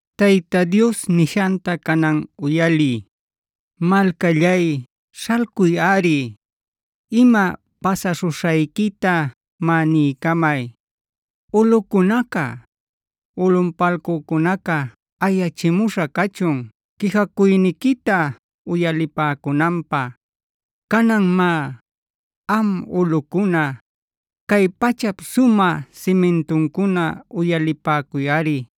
Tayta Dios nishanta canan uyaliy: “Malcallay śhalcuyꞌari, ima pasaśhuśhayquita má niycamay. Ulꞌucunaca, ulꞌunpalcücunaca ayachimuśha cachun quijacuyniquita uyalipäcunanpä. Canan má, am ulꞌucuna, cay pachap sumä simintuncuna uyalipäcuyꞌari,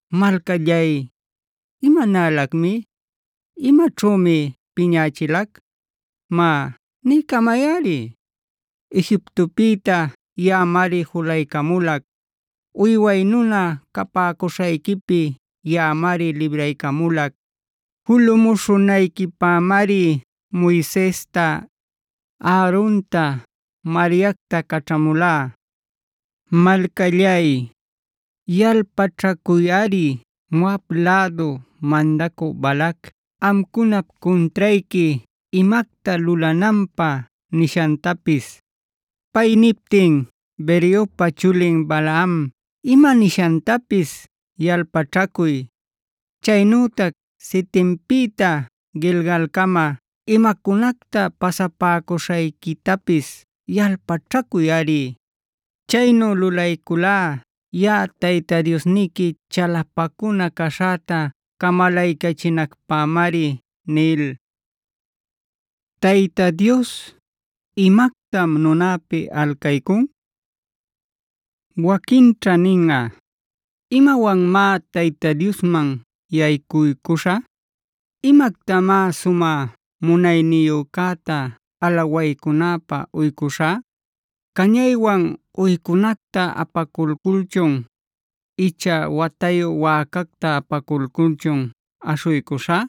“Malcallay, ¿imanalacmi? ¿Imaćhümi piñächilac? Má, niycamayꞌari. Egiptopïta yaꞌamari julaycamulac;b uyway nuna capäcuśhayquipi yaꞌamari libraycamulac. Julumuśhunayquipämari Moisesta, Aaronta,c Mariactad caćhamulá. Malcallay, yalpaćhacuyꞌari Moab lädu mandacü Balac amcunap cuntrayqui imacta lulananpä nishantapis.e Pay niptin Beorpa chulin Balaam ima nishantapis yalpaćhacuy. Chaynütac Sitimpïta Gilgalcamafg imacunacta pasapäcuśhayquitapis yalpaćhacuyꞌari. Chaynu lulayculá yaꞌa Tayta Diosniqui chalapacuna caśhäta camalaycachinacpämari” nil. Tayta Dios, ¿imactam nunäpi alcaycun? Waquinćha ninꞌa: “¿Imawanmá Tayta Diosman yaycuycuśhä? ¿Imactamá Sumä Munayniyücäta alawaycunäpä uycuśhä? ¿Cañaywan uycunacta apaculculchun icha watayu wäcacta apaculculchun aśhuycuśhä?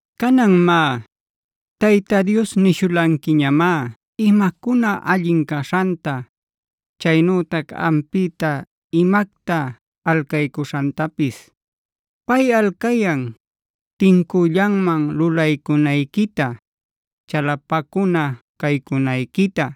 Canan má, Tayta Dios nishulanquiñamá imacuna allin caśhanta, chaynütac ampïta imacta alcaycuśhantapis. Pay alcayan: tincüllanman lulaycunayquita, chalapacuna caycunayquita,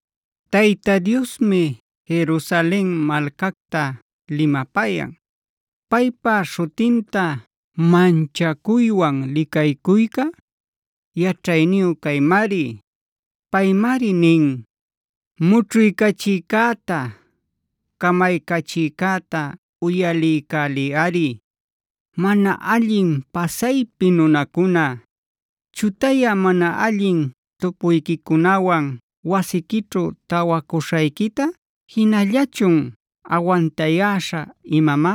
Tayta Diosmi Jerusalen malcacta limapayan. Paypa śhutinta manchacuywan licaycuyca, yaćhayniyu caymari. Paymari nin: “Mućhuycachïcäta, camaycachïcäta uyaliycäliyꞌari. ¡Mana allin pasaypi nunacuna! ¿Chutayä mana allin tupuyquicunawan wasiquićhu tawacuśhayquita jinallachun awantayäśha imamá?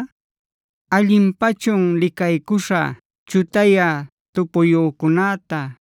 ¿Allinpachun licaycuśha chutayä tupuyücunäta,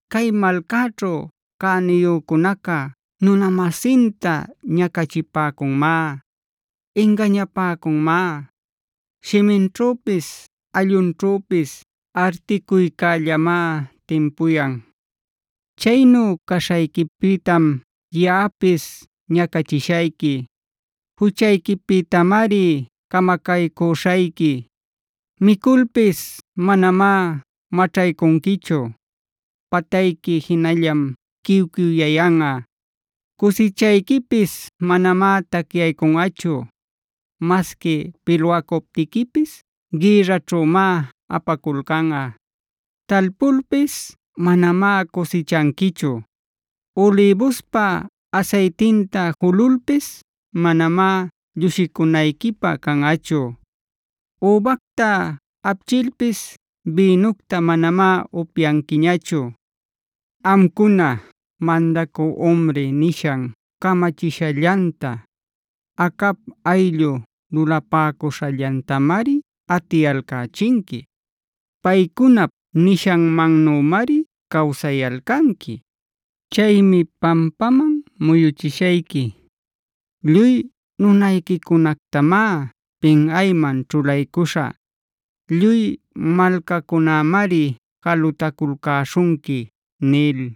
Cay malcaćhu cäniyücunaca nunamasinta ñacachipäcunmá, ingañapäcunmá. Shiminćhüpis allunćhüpis articuycällamá timpuyan. “Chaynu caśhayquipïtam yaꞌapis ñacachishayqui. Juchayquipïtamari camacaycüśhayqui. Miculpis manamá maćhaycunquichu. Patayqui jinallam quiw-quiwyayanꞌa. Cusichayquipis manamá tacyaycunꞌachu; masqui pilwacuptiquipis gïrraćhümá apaculcanꞌa. Talpulpis manamá cusichanquichu. Ulïbuspa asaytinta jululpis manamá llushicunayquipä canꞌachu; übacta apchilpis bïnucta manamá upyanquiñachu. “Amcuna mandacü Omri nishan camachishallanta, Acab ayllu lulapäcuśhallantamari atiyalcächinqui.j Paycunap nishanmannümari cawsayalcanqui. Chaymi pampaman muyüchishayqui; lluy nunayquicunactamá pinꞌayman ćhulaycüśhä. Lluy malcacunamari jalutaculcäśhunqui” nil.